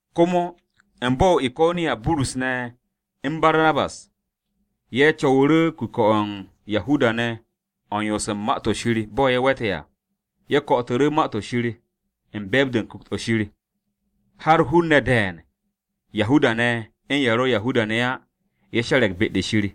Komo, u̱n bo̱-o̱ o-Iko̱niya, Burus ne̱, u̱n Barnabas ye̱ co̱wu̱ru̱ kuke̱-o̱ Yahuda-ne̱ o̱ u̱n yoos u̱n Ma-to̱ Shir bo̱ ye̱ we̱te̱ à. Ye̱ ko̱'o̱tu̱ru̱ Ma-to̱ Shir u̱n be̱e̱b-de Ku̱kt-o̱ Shir, har hun-ne̱ de̱e̱n Yahuda-ne̱ u̱n ye̱ ro̱ Yahuda-ne̱ á, ye̱ she̱re̱g be-de Shir.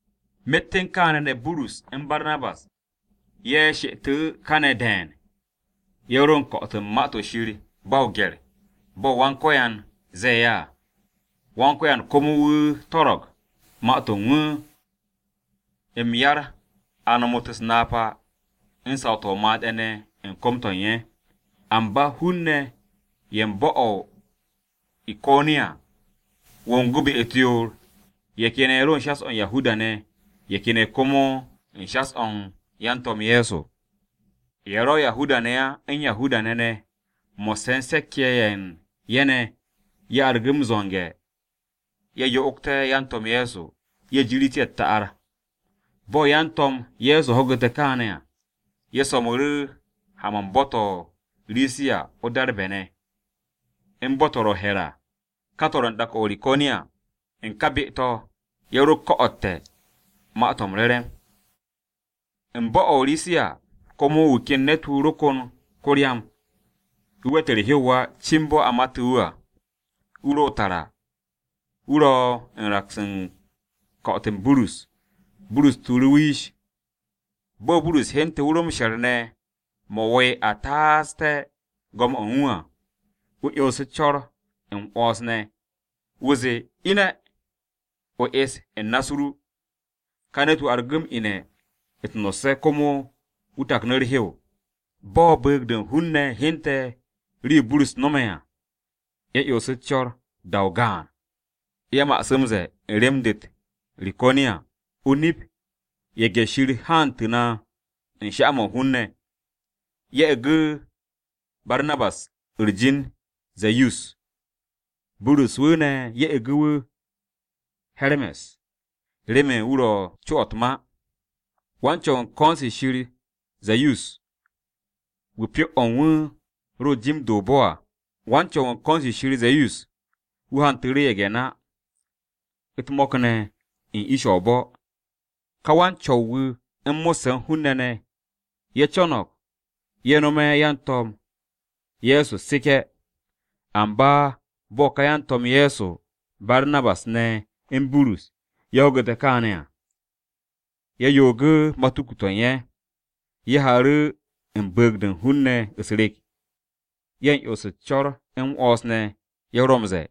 Myet u̱n kaane̱ ne̱, Burus u̱n Barnabas ye̱ she'etu̱ kane̱ de̱e̱n, ye̱ ro u̱n ko̱'o̱t u̱n Ma-to̱ Shir ba o-gye̱r bo̱ Wan-Ko̱yan ze̱e̱ ye̱ à. Wan-Ko̱yan komo wu̱ su̱u̱te̱ ma-to̱ u̱n wu̱ m-yar, a nomot u̱s-napa u̱n saw-to̱ o-made̱ ne̱ u̱n kom-to̱ u̱n ye̱. Amba hun-ne̱ ye̱ u̱n bo̱-o̱ o-Iko̱niya wongu̱ be-u̱t yoor, ye̱ ken ye̱ ro u̱n shas-o̱ Yahuda-ne̱, ye̱ ken ye̱ komo u̱n shas-o̱ u̱n yan-To̱m Ye̱so. Ye̱ ro Yahuda-ne̱ á u̱n Yahuda-ne̱ ne̱ mo̱sse̱ u̱n se̱k-ye̱ ye̱ u̱n ye̱ ne̱, ye̱ argu̱ m-zo̱nge̱ ye̱ yo'ogté̱ yan-To̱m Ye̱so, ye̱ jirit ye̱ u̱t-ta'ar. Bo̱ yan-To̱m Ye̱so ho̱gu̱te̱ kaane̱ à, ye̱ so̱mu̱ru̱ ha-mo̱ u̱n bo̱-to̱ o-Risiya o-Darbe̱ ne̱, u̱n bo̱-to̱ ro̱ o-he̱r à. Ka to̱ ro̱ u̱n dak-o̱ o-Riko̱niya. U̱n ka be-to̱ ye̱ ro ko̱'o̱tte̱ Ma-to̱ m-Re̱re̱m. U̱n bo̱-o̱ o-Risiya, komo wu̱ ken ne̱t-wu̱ ro kon ko-ryam, wu̱ we̱t u̱r-hew á cin bo̱ a matu̱ wu̱ à. Wu̱ ro tara, wu̱ ro̱ u̱n raks u̱n ko̱'o̱t-o Burus. Burus tuuru̱ wu̱ yish. Bo̱ Burus hyente̱ wu̱ ro m-she̱r ne̱ mo̱ wo̱o̱'e̱ a taaste̱ go̱m-o̱ u̱n wu̱ à, wu̱ 'yonsu̱ co̱r m-'wo̱ns ne̱. Wu̱ zee, “Ine̱, o es u̱n na-u̱s ru!” Ka ne̱t-wu̱ argu̱ m-ine̱ u̱t-no̱sse̱ komo wu̱ taknu̱ u̱r-hew. Bo̱ bu̱u̱g-de u̱n hun-ne̱ hyente̱ rii-yo Burus no̱me̱ à, ye̱ 'yonsu̱ u̱s-co̱r. Da-o gaan ye̱ ma'asu̱ m-ze̱e̱ u̱n rem-de u̱t-Riko̱niya, “O-nip, ye̱ge̱-shir haantu̱ na u̱n sha-mo̱ u̱n hun-ne̱!” Ye̱ e̱gu̱ Barnabas u̱r-jin Ze̱yus, Burus ne̱, ye̱ e̱gu̱ wu̱ He̱rme̱s, remen wu̱ ro co-o̱ u̱t-ma. Wan-Co̱w u̱n ko̱n-se shir Ze̱yus, wu̱ pyo-o̱ u̱n wu̱ ro u̱n jim-de o-bo̱ à. Wan-co̱w-wu̱ u̱n ko̱n-se shir Ze̱yus, wu̱ hantu̱ru̱ ye̱ge̱-na, u̱t-mo̱k ne̱ u̱n ish-o̱ o-bo̱. Ká wan-co̱w-wu̱ u̱n ko̱n-se shir Ze̱yus wu̱ mo̱sse̱ u̱n hun-ne̱ ne̱, ye̱ co̱no̱g ye̱ nome̱ yan-To̱m Ye̱so u̱t-seke̱. Amba bo̱ ka yan-To̱m Ye̱so ye̱, Barnabas ne̱ u̱n Burus, ho̱gu̱te̱ kaane̱ à, ye̱ yoogu̱ matuku-to̱ u̱n ye̱. Ye̱ haaru̱ u̱n bu̱u̱g-de u̱n hun-ne̱ u̱s-rek, ye̱ u̱n 'yons u̱s-co̱r m-'wo̱ns ne̱ ye̱ ro m-ze̱e̱,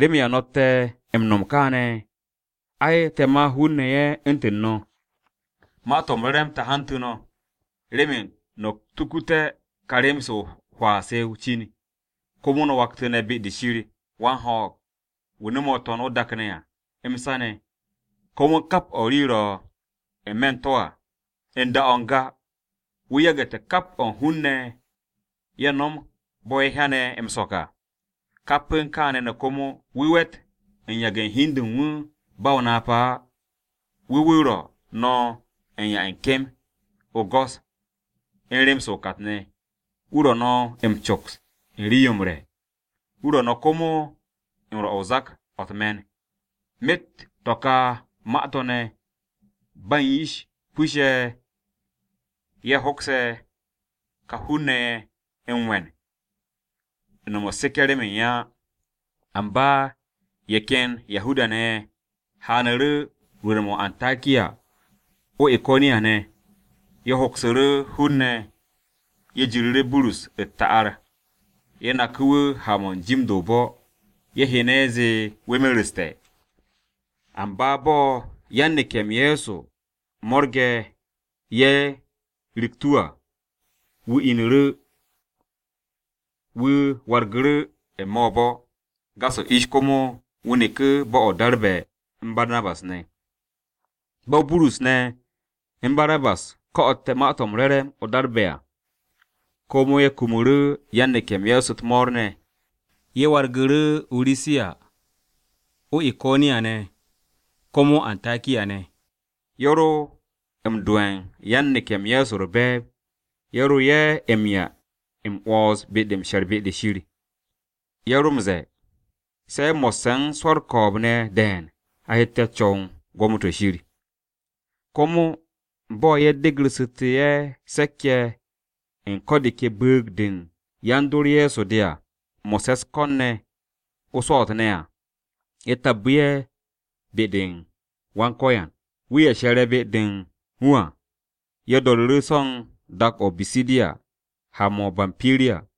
“¿Remen ya no̱tte̱ m-no̱m kàane̱? Ai, te̱ ma hun-ne̱ ye̱ u̱ntu̱n no̱, Ma-to̱ m-Re̱re̱m te̱ hantu̱ no̱, remen no̱ tukuté̱ ka rem-se o-hwaa se o-cin, komo no̱ waktu̱nte̱ be-de Shir wan-ho̱o̱g, wu̱ no̱me̱ o-To̱n, o-dak ne̱ à, m-sa ne̱, komo u̱n kap o̱ u̱n rii-yo ro̱ ne̱ n-me̱ u̱n to̱ à. U̱n da-o̱ n-ga, wu̱ yagu̱te̱ kap o̱ u̱n hun-ne̱ ye̱ nom bo̱ ye̱ hyane̱ m-so̱k à. Kap u̱n kaane̱ ne̱ komo, wu̱ we̱t u̱n yage̱ u̱n hi u̱n de u̱n wu̱ ba o-napa á. Wu̱ wu̱ ro̱ no̱ u̱n 'ya u̱n kem, o-go̱s u̱n rem-se o-kat ne̱. Wu̱ ro̱ no̱ m-coks u̱n rii-yo m-re̱, wu̱ ro̱ no̱ komo u̱n rwo̱ u̱n zak-o̱ u̱t-me̱n.” Myet u̱n to̱ ka ma-to̱ ne̱, ba u̱n yish pus-se ye̱ hokse̱ ka hun-ne̱ ye̱ m-we̱n u̱n no̱m u̱t-seke̱ remen ye̱ á. Amba ye̱ ken Yahuda-ne̱ ye̱ haanu̱ru̱ rwu̱u̱n-mo̱ o-Antakiya o-Iko̱niya ne̱, ye̱ hoksu̱ru̱ hun-ne̱ ye̱ jiru̱ru̱ Burus u̱t-ta'ar ye̱ naku̱ wu̱ ha-mo̱ u̱n jim-de o-bo̱, ye̱ hyene̱ ye̱ zee wu̱ mereste̱. Amba bo̱ yan-neke̱-m Ye̱so mo̱rge̱ ye̱ riktu̱ wu̱ à, wu̱ inu̱ru̱ wu̱ wargu̱ru̱ n-me̱ o-bo̱. Gas-o ish komo wu̱ neku̱ bo̱-o̱ o-Darbe̱ u̱n Barnabas ne̱. Bo̱ Burus ne̱ u̱n Barnabas ko̱'o̱tte̱ Ma-to̱ m-Re̱re̱m o-Darbe̱ à, komo ye̱ kumu̱ru̱ yan-neke̱-m Ye̱so u̱t-mo̱o̱r ne̱, ye̱ wargu̱ru̱ o-Risiya, o-Iko̱niya ne̱, komo o-Antakiya ne̱, ye̱ ro m-do'e̱ u̱n yan-neke̱-m Ye̱so u̱r-be̱e̱b, ye̱ ro ye̱ m-'ya m-'wo̱ns be-de m-she̱r be-de Shir. Ye̱ ro̱ m-ze̱e̱, “Se̱ mo̱sse̱ u̱n swo̱ u̱r-ko̱o̱b ne̱ de̱e̱n a hette̱ co̱w u̱n gwo̱mo-to̱ Shir.” Komo bo̱ ye̱ degu̱rsu̱te̱ ye̱ se̱k-ye̱ u̱n ko̱ de ke bu̱u̱g-de u̱n yan-dor Ye̱so de à, mo̱sse̱ u̱s-ko̱n ne̱ o-swo̱o̱t ne̱ à, ye̱ tabbu̱ ye̱ be-u̱r Wan-Ko̱yan, wu̱ ye̱ she̱re̱ be-de u̱n wu̱ à. Ye̱ do̱ru̱ru̱ so̱ u̱n dak-o̱ o-Bisidiya ha-mo̱ o-Bampiriya.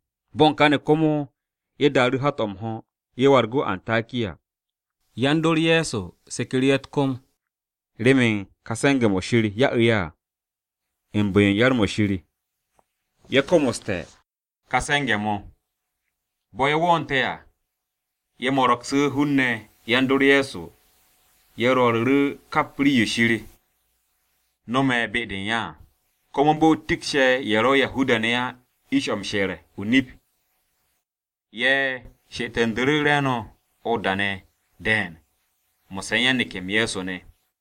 Bo̱ u̱n kane̱ komo ye̱ daaru̱ hat-o̱ m-ho̱ ye̱ wargu̱ o-Antakiya. Yan-dor Ye̱so seku̱ru̱ ye̱ u̱t-kom remen ka se̱nge̱-mo̱ Shir ya'u̱ ye̱ à. U̱n bu̱-yo u̱n yar-mo̱ Shir, ye̱ komoste̱ ka se̱nge̱-mo̱. Bo̱ ye̱ wo̱o̱nte̱ à, ye̱ mo̱ro̱gsu̱ hun-ne̱ yan-dor Ye̱so ye̱ rwo̱ru̱ kap rii-yo Shir no̱me̱ be-de u̱n ye̱ à, komo u̱n bo̱ wu̱ tikshe̱ ye̱ ro̱ Yahuda-ne̱ á ish-o̱ m-she̱r o-nip à. Ye̱ she'etu̱ndu̱ru̱ re̱e̱no̱ o-da ne̱ de̱e̱n mo̱sse̱ u̱n yan-neke̱-m Ye̱so ne̱.